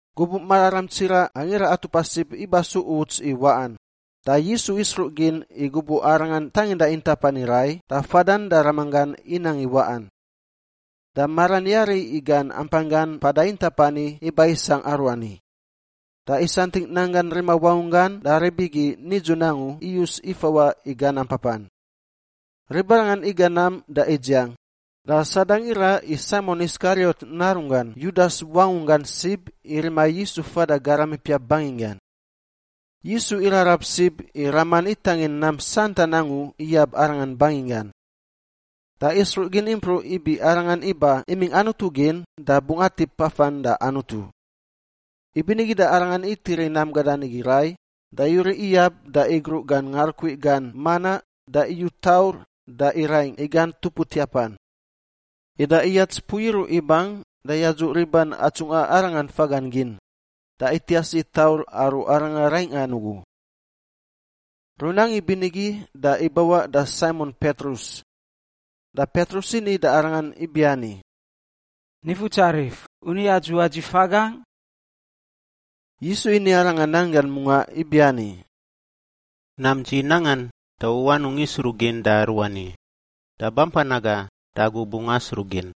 Gubuꞌ mararam tsiraꞌ Angira Atupa Sib iba su uts i waꞌan, da Yisu isruꞌ gin i gubuꞌ Arangan tanginda intap ani rai da fadan da Ramanggan inang i waꞌan. Da maran yari i gan ampanggan mpada intap ani iba isangꞌ aruani, da isantingꞌ nanggan rima wangunggan da rib igi nidzun angu iyus ifawaꞌ i gan ampapan. Ribarangan iga nam da idziang, da Sadang iraꞌ i Saimon Iskariot narunggan Yudas wangunggan sib i rima Yisu fada garam ipiap banginggan. Yisu irarab sib i Raman itangin nam santan angu iyab Arangan banginggan. Da isruꞌ gin impruꞌ ibi Arangan iba imingꞌ Anutu gin da bungꞌ atip afan da Anutu. Ibinigi da Arangan itiri nam gadan igi rai da yuriꞌ iyab da igruꞌ gan ngarukui gan manaꞌ da iyu taur da iraingꞌ i gan tupuatiapan. Ida iyats mpui iruꞌ ibang da yadzuꞌ riban atsungꞌa Arangan fagan gin, da itias i taur aru Aranga raingꞌan ugu. Runang ibinigi da ibawaꞌ da Saimon Petrus. Da Petrus ini da Arangan ibiani, “Nifutsarif, u ni adzuꞌa dzi fagangꞌ?” Yisu ini arangan nan gan mungaꞌ ibiani, “Nam dzi nangan, da u anungꞌ isruꞌ gin da aruani, da bampan aga da agu bungꞌ asruꞌ gin.”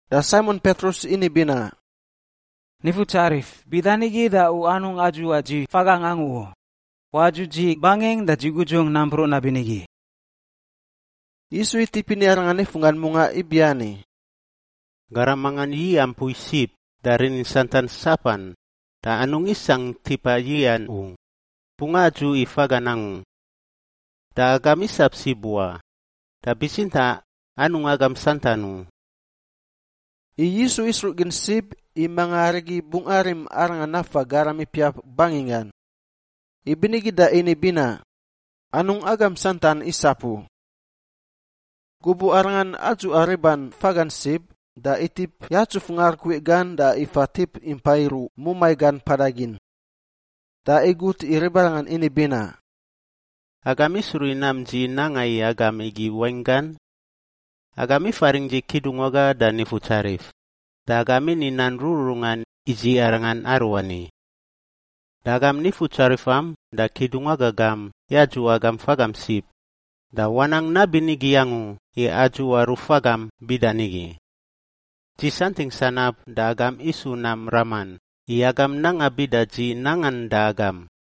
Da Saimon Petrus ini binaꞌ, “Nifutsarif, bida nigi da u anungꞌ adzuꞌa dzi fagangꞌ angu u; wadzuꞌ dzi bangingꞌ da gudzungꞌ nampruꞌ nabinigi.” Yisu itip ini arangan nifunggan mungaꞌ ibiani, “Garam mangan yiꞌa mpui sib da rinin santan sapan da anungꞌ isangꞌ tipa yiꞌan u, bungꞌ adzuꞌ i fagan angu. Da agam isap sib wa, da bitsintaꞌ anungꞌ agam santan u.” I Yisu isruꞌ gin sib i manga arigi bungꞌ arim Arangan nafa garam ipiap banginggan. Ibinigi da ini binaꞌ, “Anungꞌ agam santan isap u.” Gubuꞌ Arangan adzuꞌa riban fagan sib da itip yatsuf ngarukui gan da ifa tip impa iruꞌ mumai gan mpada gin. Da igut i ribarangan ini binaꞌ, “Agam isruꞌ i nam dzi nanga i agam igi wainggan? Agam ifaringꞌ dzi Kidungwaga da Nifutsarif, da agam ini nan rururungan i dzi arangan aruani. Da agam Nifutsarifam da Kidungwaga gam yadzuꞌ agam fagam sib, da wanang nabinigi angu i adzuꞌa rufagam bida nigi. Dzi santingꞌ sanab da agam isu nam raman i agam nanga bida dzi nangan da agam.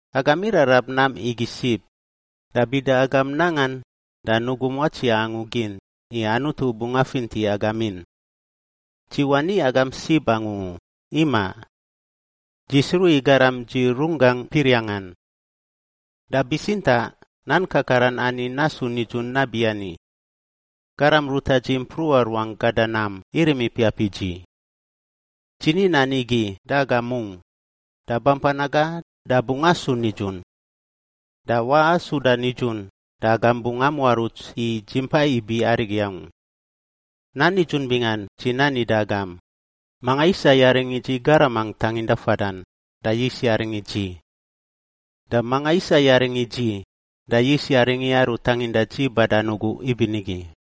Agam irarab nam igi sib, da bida agam nangan da nugum watsiaꞌ angu gin i Anutu bungꞌ afinti agam in. Dzi wani agam sib angu u, imaꞌ. Dzi sruꞌ i garam dzi runggangꞌ piriangꞌan. Da bitsintaꞌ nan kakaran ani nasu nidzun nabiani, ‘Garam ruta dzi mpruꞌa ruangꞌ gada nam irim ipiap i dzi.’ Dzi ni nan igi da agam mungꞌ, da bampan aga da bungꞌ asu nidzun. Da waꞌa suda nidzun da agam bungꞌ amuaruts i Dzi Mpa Ibi Arigi Angu. Nan nidzun bingan dzi nani da agam, manga isa yaring i dzi garamangꞌ tanginda fadan, da yis yaring i dzi. Da manga isa yaring i dzi, da yis yaring i Aru tanginda dzi badan ugu ibinigi.”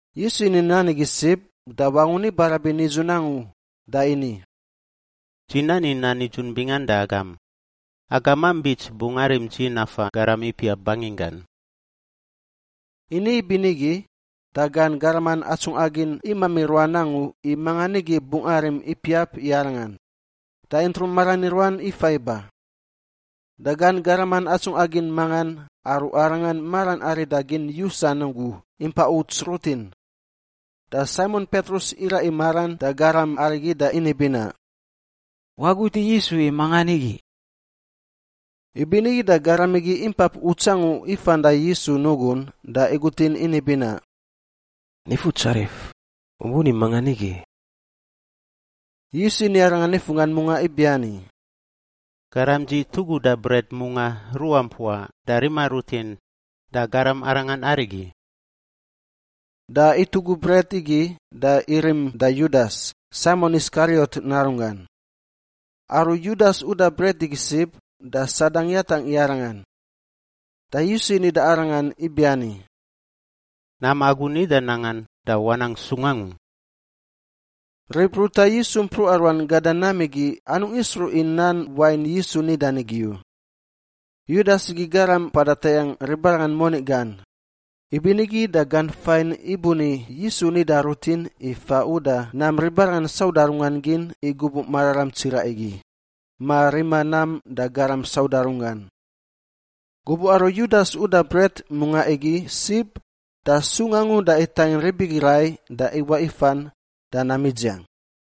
Yisu ini nan igi sib da wangun ibarabin nidzun angu da ini, “Dzi nani nan nidzun bingan da agam! Agamam bits bungꞌ arim dzi nafa garam ipiap banginggan.” Ini ibinigi, da gan garaman atsungꞌa gin imami ruan angu i mangan nigi bungꞌ arim ipiap i Arangan, da intrung maran i ruan ifa iba. Da gan garaman atsungꞌa gin mangan aru Arangan maran arida gin yusan ugu impa uts rutin. Da Saimon Petrus iraꞌ i maran da garam arigi da ini binaꞌ, “Wagut i Yisu i mangan nigi.” Ibinigi da garam igi impap uts angu ifan da Yisu nugun da igutin ini binaꞌ, “Nifutsarif, u buni mangan nigi?” Yisu ini arangan nifunggan mungaꞌ ibiani, “Garam dzi tuguda bret mungaꞌ ruꞌa mpuaꞌ da rima rutin, da garam arangan arigi.” Da itugu bret igi da irim da Yudas, Saimon Iskariot narunggan. Aru Yudas uda bret igi sib, da Sadang yatangꞌ i arangan. Da Yisu ini da arangan ibiani, “Nam agu nida nangan da wanang sung angu.” Rib ruta Yisu mpruꞌa ruan gada nam igi anungꞌ isruꞌ i nan wain Yisu nidan igi u. Yudas igi garam mpada tayangꞌ ribarangan moni gan, ibinigi da gan fain ibuni Yisu nida rutin i fa uda nam ribarangan sauda runggan gin i gubuꞌ mararam tsiraꞌ igi, ma rima nam da garam sauda runggan. Gubuꞌ aru Yudas uda bret mungaꞌ igi sib, da sung angu da itangin rib igi rai da iwaꞌ ifan da nam idziang.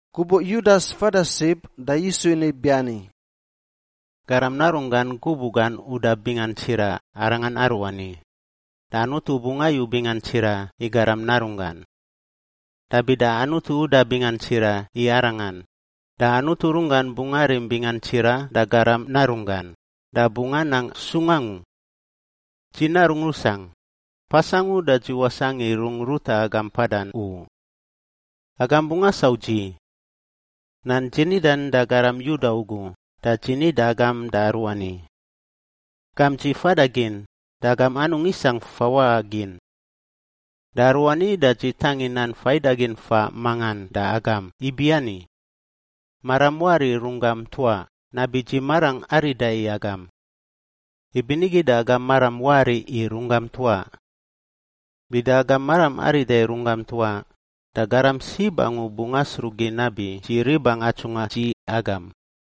Gubuꞌ Yudas fada sib da Yisu ini ibiani, “Garam Narunggan gubuꞌ gan uda bingan tsiraꞌ arangan aruani, da Anutu bungꞌ ayu bingan tsira i Garam Narunggan. Da bida Anutu uda bingan tsiraꞌ i Arangan, da Anutu runggan bungꞌ arim bingan tsiraꞌ da Garam Narunggan, da bungꞌ anang sung angu. Dzi narungꞌ rusangꞌ, pas angu da dzi wasangꞌ i rungꞌ ruta agam mpadan u. Agam bungꞌ asau dzi. Nan dzi nidan da garam Yuda ugu da dzi ni da agam da aruani. Gamp dzi fada gin, da agam anungꞌ isangꞌ fawaꞌa gin. Da aruani da dzi tangin nan faidagin faꞌ mangan da agam ibiani: Maram wari i runggam ntuaꞌ nabi dzi marangꞌ arida i agam. Ibinigi da agam maram wari i runggam ntuaꞌ. Bida agam maram arida i runggam ntuaꞌ da garam sib angu bungꞌ asruꞌ gin nabi dzi ribangꞌ atsungꞌa dzi agam.”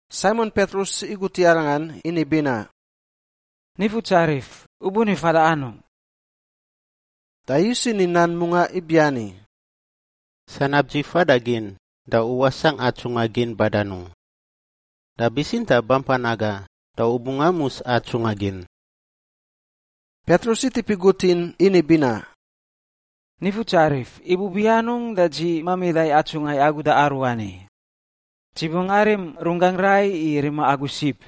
Saimon Petrus igut i Arangan ini binaꞌ, “Nifutsarif, U buni fada anungꞌ?” Da Yisu ini nan mungaꞌ ibiani, “Sanab dzi fadagin da u wasangꞌ atsungꞌa gin badan u. Da bitsintaꞌ bampan aga da u bungꞌ amus atsungꞌa gin.” Petrus itip igutin ini binaꞌ, “Nifutsarif! Ibubi anungꞌ da dzi mamida atsungꞌa agu da aruani? Dzi bungꞌ arim runggangꞌ rai i rima agu sib.”